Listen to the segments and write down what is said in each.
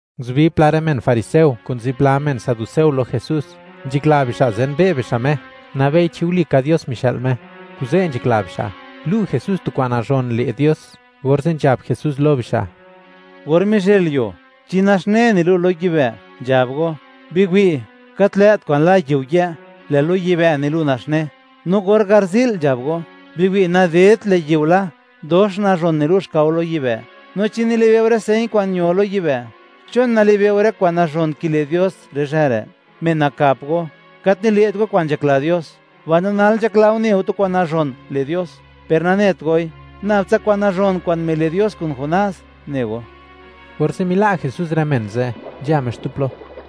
Nguzubi pla rë men fariseo kun zipla men saduceo lo Jesús, nzhakla bixa' zenbe' bixa' Me (wi' bixa' xmod nak Me), nabei chi walika Dios mixë'l Me; kuze' nzhakla bixa', lu' Jesús tu kwa'n nazhon le' Dios, orze' nzhab Jesús lo bixa': ―Or mizhëlyuo, chi naxne nilu' lo yibë', nzhab go: “Biwi', gat lë't kwa'n la yiu yë', lë' lo yibë' nilu' naxne”; no or garzi'l nzhab go: “Biwi', nadedt lë' yiu la, dox nazhon nilu' xkao lo yibë'.” No chi nilibe' go rë señ kwa'n ño lo yibë', ¿chon nalibe'o rë kwa'n nazhon kile' Dios rë zhë re'? Men nakap go, gat nile't go kwa'n nzhakla Dios, mbaino nal nzhakla go, ne go tu kwa'n nazhon le' Dios. Per nanet goi; nab tsa kwa'n nazhon kwa'n mile' Dios kun Jonás, ne go. Orze' mila' Jesús rë men ze', nzha Me xtu plo.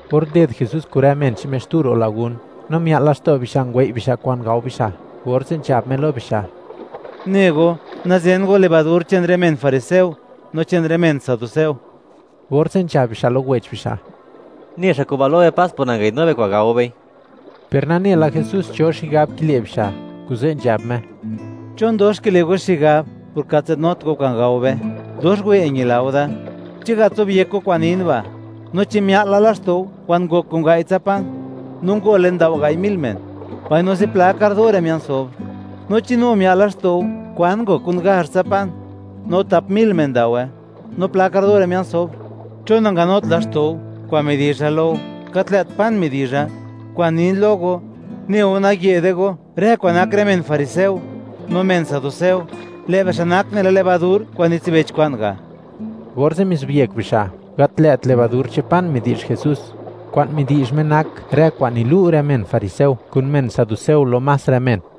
Or nded Jesús kun rë men che'n Me xtu ro' lagún, no mia'l laxto' bixa' ngwei' bixa' kwa'n gao bixa', orze' nzhab Me lo bixa': ―Ne go, nazen go levadur che'n rë men fariseo, no che'n rë men saduceo. Orze' nzhab bixa' lo wech bixa': ―Ne xa' kuba' lo be, pas por nangayi'dnu be kwa'n gao bei. Per nane la Jesús cho xigab kile' bixa', kuze' nzhab Me: ―¿Chon dox kile' go xigab por gat nzadnut go kwa'n gao be? ¡Dox wë' ñila go da! ¿Chi gat zobyek go kwa'n nin ba'?, no, ¿chi mia'l la laxto' go kwan ngok kun gai' tsa pan no ngole ndao gai' mil men, mbaino zipla kardore mia'n sobr? No, ¿chi nu mia'l laxto' go kwan ngok kun gazh tsa pan, no tap mil men ndaowe, no pla kardore mia'n sobr? ¿Chon nanganut laxto' go kwa'n midizha lo go, gat lë't pan midizha? Kwa'n nin lo go, ne go nayë'de go rë kwa'n nak rë men fariseo no men saduceo; lë' bixa' nak nela levadur kwa'n nitsibech kwa'n ga'. Orze' mizobyek bixa', gat lë't levadur che'n pan midi'zh Jesús; kwa'n midi'zh Me nak rë kwa'n nilu' rë men fariseo kun men saduceo lo más rë men.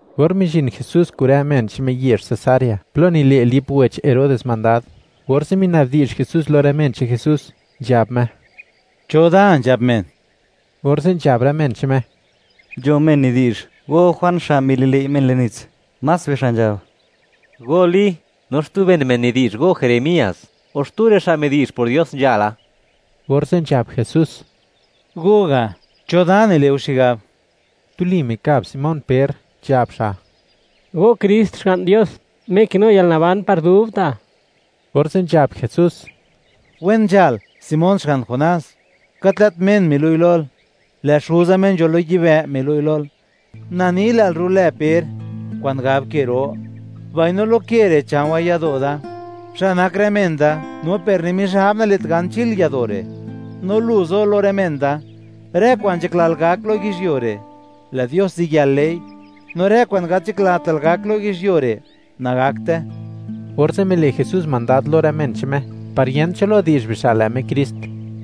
Or mizhin Jesús kun rë men che'n Me yezh Cesarea plo nile' Lip wech Herodes mandad, orze' mina'bdi'zh Jesús lo rë men che'n Jesús, nzhab Me: ―¿Cho da nzhab men? Orze' nzhab rë men che'n Me: ―Nzho men nidi'zh, go Juan xa' mili'lëi' men le'n nits; más bixa' nzhab, go Li; no xtu ben men nidi'zh go Jeremías, o xtu rë xa' midi'zh por Dios nzhala. Orze' nzhab Jesús: ―Go ga', ¿cho da nile' go xigab? Tuli mikab Simón Per, nzhab xa': ―Go Krist, Xga'n Dios, Me kinu yalnaban par dubta'. Orze' nzhab Jesús: ―Wen nzhal, Simón xga'n Jonás; gat lë't men milu'i lol, lë' Xuza Me nzho lo yibë' milu'i lol. Na ni, lël rulë Per (kwa'n gab ke ro), mbaino lo ke re' cha̱o̱wa̱ yado' da xa' nak rë men da, no per ni Mizhab nale't gan chil yado' re'. No lu zo lo rë men da: Rë kwa'n nzhaklal gak lo yizhyuo re', lë' Dios ziyël le'i; no rë kwa'n gat nzhaklatal gak lo yizhyuo re', nagakte. Orze' mile' Jesús mandad lo rë men che'n Me, par yent cho lo di'zh bixa', lë' Me Krist.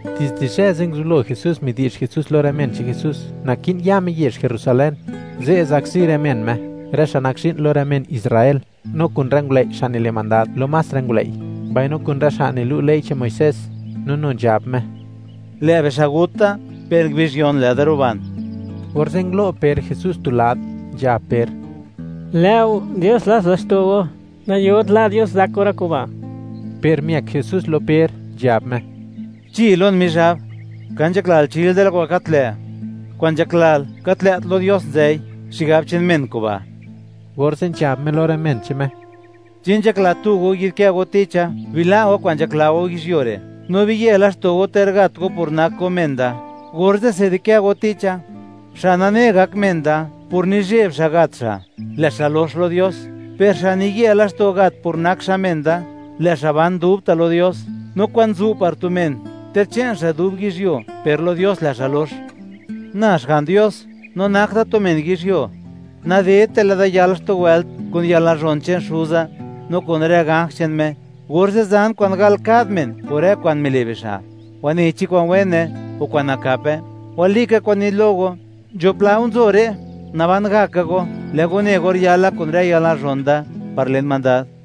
Dizde zhë ze' nguzublo Jesús midi'zh Jesús lo rë men che'n Jesús, naki'n ya Me yezh Jerusalén. Ze' zakzi rë men Me, rë xa' nak zhi'n lo rë men Israel, no kun rë ngulëi' xa' nile' mandad lo más rë ngulëi', mbaino kun rë xa' nilu' ley che'n Muisés; no nu nzhab Me: ―Lë' bixa' gut da, per ngubizh yon lë'da ruban. Orze' ngulo' Per Jesús tu lad, nzhab Per: ―Lë' go, ¡Dios lats laxto' go! ¡Nayot la' Dios zak go rë kuba'! Per miëk Jesús lo Per, nzhab Me: ―¡Chi lon Mizhab! ¡Ka nzhaklal chil da lo kwa'n gat lë'; kwa'n nzhaklal, gat lë't lo Dios nzëi; xigab che'n men kuba'! Orze' nzhab Me lo rë men che'n Me: ―Chi nzhakla tu go yi'dkë go ticha, bila' go kwa'n nzhakla go yizhyuo re', no biye laxto' go ter gat go por nak go men da, orze'se di'kë go ticha. Xa' nane gak men da por nizheb xa' gat xa', lë' xa' lox lo Dios; per xa' niye laxto' gat por nak xa' men da, lë' xa' ban dubta' lo Dios, no, ¿kwan zu' par tu men, ter che'n xa' dub yizhyuo, per lo Dios lë' xa' lox? Na, Xga'n Dios no nak Da tu men yizhyuo, nadedte lë' da yal xtu wëlt kun yalnazhon che'n Xuza, no kun rë ganj che'n Me, orze' zan kwa'n gal kad men por rë kwa'n mile' bixa', wanei chi kwa'n wene o kwa'n nakape. Walika kwa'n nin lo go, nzho pla go nzo re', naban gaka go lë' go ne or yala kun rë yalnazhon Da par len mandad.